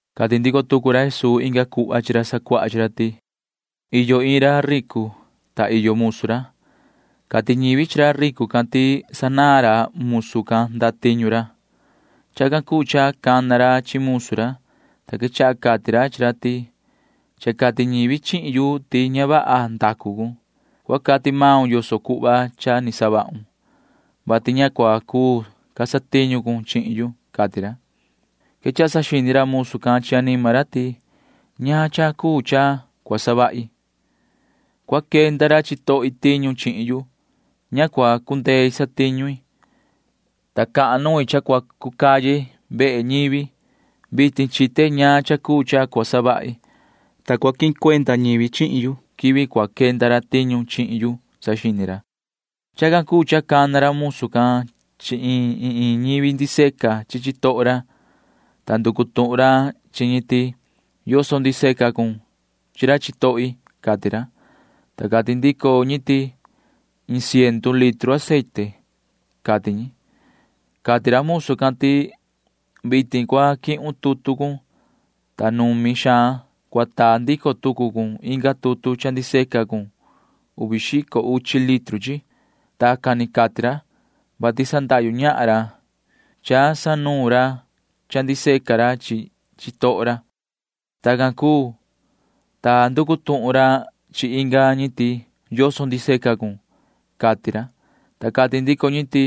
Cati ndico tucu ra Jesuu inga cuhva chi ra sacuaha chi ra ti: ―Iyo iin ra ricu, ta iyo musu ra. Cati ñivi chi ra ricu can ti sanaan ra musu can ndatiñu ra. Chacan cuu cha cana ra chi musu ra, ta quechaha cati ra chi ra ti: “Cha cati ñivi chihin yu ti ña vaha ndacu cun. Cua cati maun yoso cuhva cha ni savahun, vati ña cua cuu ca satiñu cun chihin yu,” cati ra. Quechaha saxini ra musu can chi anima ra ti: “¿Ñaan cha cuu cha cua savahi? Cua quenda ra chitohi tiñu chihin yu. Ña cua cundei satiñu i, ta cahan nuin cha cua cu caye vehe ñivi. Vitin chite ñaan cha cuu cha cua savahi, ta ni cua quihin cuenda ñivi chihin yu quivi cua quenda ra tiñu chihin yu,” saxini ra. Chacan cuu cha cana ra musu can chi iin iin ñivi ndiseca chi chitoho ra, ta nducu tuhun ra chi ñi ti: “¿Yoso ndiseca cun chi ra chitohi?” cati ra, ta cati ndico ñi ti: “Iin ciendu litru aceite,” cati ñi. Cati ra musu can ti: “Vitin cua quihun tutu cun, ta numi xaan cua taa ndico tucu cun inga tutu cha ndiseca cun uvi xico uchi litru chi.” Tacan ni cati ra, [vati sandahyu ñahan ra cha sanuun ra cha ndiseca ñi chi chitoho ra]. Tacan cuu, ta nducu tuhun ra chi inga ñi ti: “¿Yoso ndiseca cun?” cati ra, ta cati ndico ñi ti: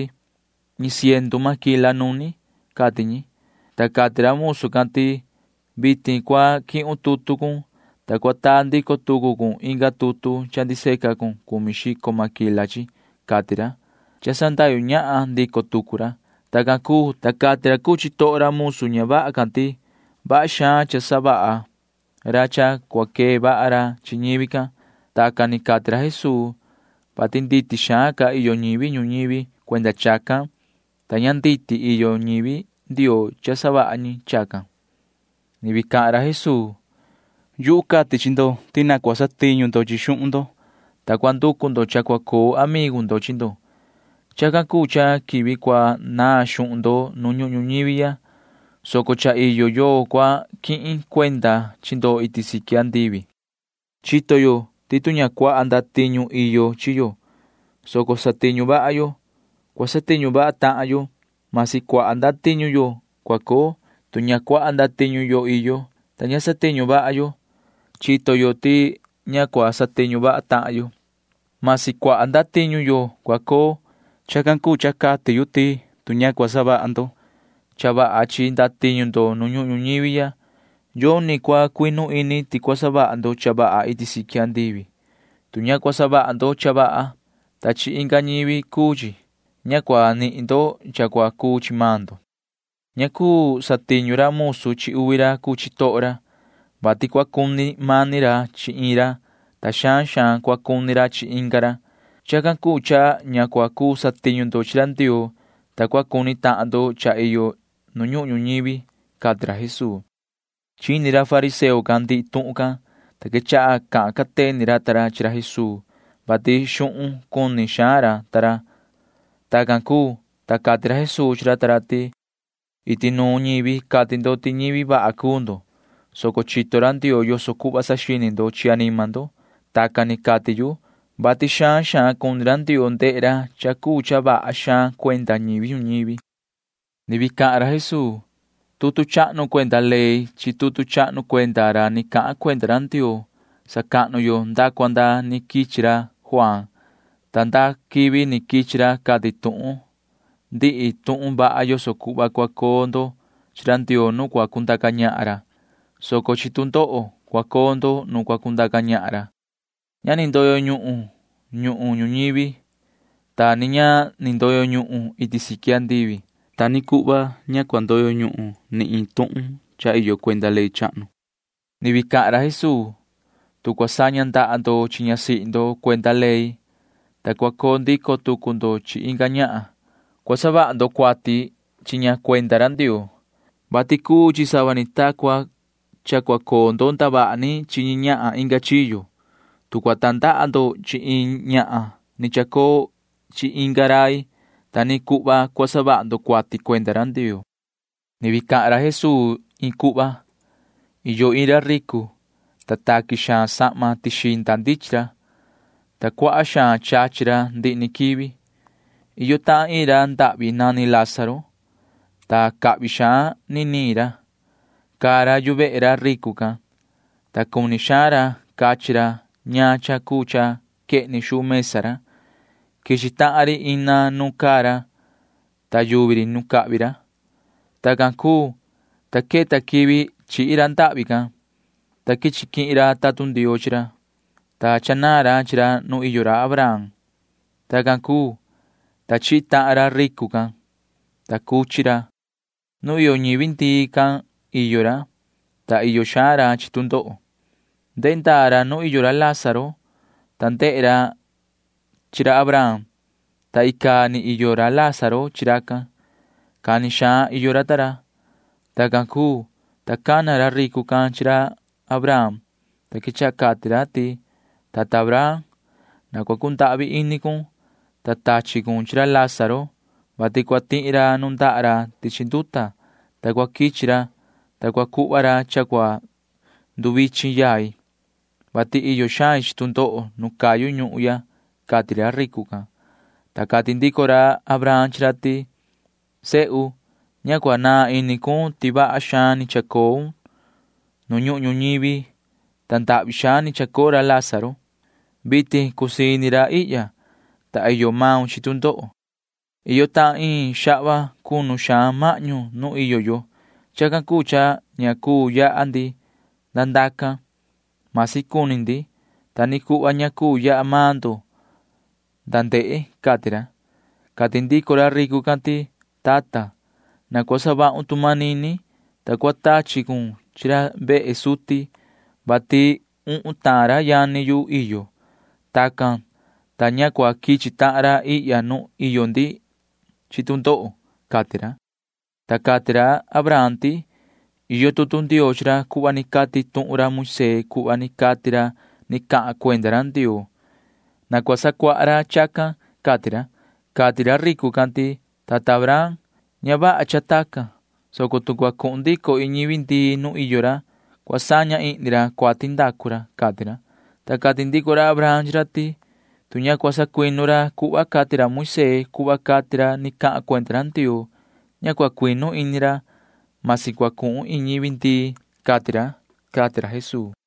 “Iin ciendu máquila nuni,” cati ñi, ta cati ra musu can ti: “Vitin cua quihun tutu cun, ta cua taa ndico tucu cun inga tutu cha ndiseca cun cumi xico máquila chi,” cati ra [cha sandahyu ñahan ndico tucu ra]. Tacan cuu, ta cati ra cuu chitoho ra musu ña vaha can ti vaha xaan cha savaha ra cha cua quee vaha ra chi ñivi can. [Tacan ni cati ra Jesuu,] vati nditi xaan ca iyo ñivi ñuñivi cuenda chacan, ta ña nducu ñivi Ndioo cha savaha ñi chacan. [Ni vii cahan ra Jesuu:] ’Yuhu cati chi ndo ti na cua satiñu ndo chi xuhun ndo, ta cua nducu ndo cha cua coo amigu ndo chi ndo. Chacan cuu cha quivi cua naan xuhun ndo nu ñuhun ñuñivi, soco cha iyo yoo cua quihin cuenda chi ndo iti siqui andivi. ’Chito yo ti tu ña cuaha ndatiñu iyo chi yo, soco satiñu vaha yo, cua satiñu vaha tahan yo―masi cuaha ndatiñu yo cua coo. Tu ña cuaha ndatiñu yo iyo, ta ña satiñu vaha yo, chito yo ti ña cua satiñu vaha tahan yo―masi cuaha ndatiñu yo cua coo. Chacan cuu cha cati yu ti tu ña cua savaha ndo cha vaha chi ndatiñu ndo nu ñuhun ñuñivi ya, yoni cua cuinu ini ti cua savaha ndo cha vaha iti siqui andivi. Tu ña cua savaha ndo cha vaha, ta chi inga ñivi cuu chi, ña cua nihin ndo cha cua cuu chi maan ndo. ’Ña cuu satiñu ra musu chi uvi ra cuu chitoho ra, vati cua cuni mani ra chi iin ra, ta xaan xaan cua cuni ra chi inga ra. Chacan cuu cha ña cua cuu satiñu ndo chi ra Ndioo, ta cua cuni tahan ndo cha iyo nu ñuhun ñuñivi ―cati ra Jesuu. Chini ra fariseo can ndihi tuhun can, ta quechaha cahan cateni ra ta ra chi ra Jesuu, vati xuhun cuni xaan ra ta ra. Tacan cuu, ta cati ra Jesuu chi ra ta ra ti: ―Iti nuun ñivi cati ndo ti ñivi vaha cuu ndo, soco chito ra Ndioo yoso cuhva saxini ndo chi anima ndo. Tacan ni cati yu, vati xaan xaan cuni ra Ndioo ndehe ra cha cuu cha vaha xaan cuenda ñivi ñuñivi. [Ni vii cahan ra Jesuu:] ’Tutu chahnu cuenda ley chi tutu chahnu cuenda ra ni cahan cuenda ra Ndioo sacahnu yo nda cua nda ni quichi ra Juaan, ta nda quivi ni quichi ra cati tuhun ndi tuhun vaha yoso cuhva cua coo ndo chi ra Ndioo nu cua cundaca ñahan ra, soco chi tu ndoho cua coo ndo nu cua cundaca ñahan ra. ’Ña ni ndoyo ñuhun ñuhun ñuñivi, ta ni ña ni ndoyo ñuhun iti siqui andivi. Ta ni cuhva ña cua cuu ndoyo ñuhun ni iin tuhun cha iyo cuenda ley chahnu. [Ni vii cahan ra Jesuu:] ’Tu cua saña ndaha ndo chi ñasihi ndo cuenda ley, ta cua coo ndico tucu ndo chi inga ñahan, cua savaha ndo cuati chi ña cuenda ra Ndioo, vati cuu chi sava ni ta cua coo ndo ndavaha ni chi ñi ñahan inga chiyo. Tu cua tandaha ndo chi iin ñahan ni chacoo chi inga rai, ta ni cuhva cua savaha ndo cuati cuenda ra Ndioo. [Ni vii cahan ra Jesuu iin cuhva:] ’Iyo iin ra ricu, ta taqui xaan sahma tixinda ndichin ra, ta cuaha xaan chachi ra ndihi ni quivi. Iyo tahan iin ra ndahvi nani Lázaro, ta cahvi xaan niniin ra. Caa ra yu vehe ra ricu can, ta cuni xaan ra cachi ra ñaan cha cuu cha quehni xuu mesa ra. Quichi tahan ri ina nu caa ra, ta yuvi ri nu cahvi ra. Tacan cuu, ta queta quivi chihi ra ndahvi can, ta quichi quihin ra tatun Ndioo chi ra, ta chanaan ra chi ra nu iyo ra Abraham. Tacan cuu, ta chihi tahan ra ricu can, ta cuchi ra. Nu iyo ñivi ndii can iyo ra, ta iyo xaan ra chi tu ndoho. Ndehe ndaa ra nu iyo ra Lázaro, ta ndehe ra chi ra Abraham, ta icaa ni iyo ra Lázaro chi racan. Cani xaan iyo ra ta ra. Tacan cuu, ta cana ra ricu can chi ra Abraham, ta quechaha cati ra ti: “Tata Abraham, na cua cundahvi ini cun, ta tachi cun chi ra Lázaro, vati cua tihi ra nundaha ra tichi nduta, ta cua quichi ra, ta cua cuhva ra cha cua nduvichin yai, vati iyo xain chi tu ndoho nu cayu ñuhun ya,” cati ra ricu can, ta cati ndico ra Abraham chi ra ti: “Sehu, ña cua naan ini cun ti vaha xaan ni chacoun nu ñuhun ñuñivi, ta ndahvi xaan ni chacoo ra Lázaro. Vitin cusii ini ra ihya, ta iyo maun chi tu ndoho. Iyo tahan iin xahva cunu xaan mahñu nu iyo yo. Chacan cuu cha ña cuu yaha ndi nda ndacan―masi cuni ndi. Ta ni cuhva ña cuu yaha maan ndo nda ndehe,” cati ra. Cati ndico ra ricu can ti: “Tata, na cua savahun tu manini, ta cua tachi cun chi ra vehe suti, vati uhun tahan ra yani yu iyo. Tacan, ta cha ña cua quichi tahan ra ihya nu iyo ndi chi tu ndoho,” cati ra, ta cati ra Abraham ti: “Iyo tutu Ndioo chi ra cuhva ni cati tuhun ra Moisee cuhva ni cati ra ni cahan cuenda ra Ndioo. Na cua sacuaha ra chacan,” cati ra. Cati ra ricu can ti: “Tata Abraham, ña vaha cha tacan, soco tu cua cuhun ndico iin ñivi ndii nu iyo ra, cua saña ihni ra cuati ndacu ra,” cati ra, ta cati ndico ra Abraham chi ra ti: “Tu ña cua sacuinu ra cuhva cati ra Moisee cuhva cati ra ni cahan cuenda ra Ndioo, ña cua cuinu ini ra―masi cua cuhun iin ñivi ndii,” cati ra ―cati ra Jesuu.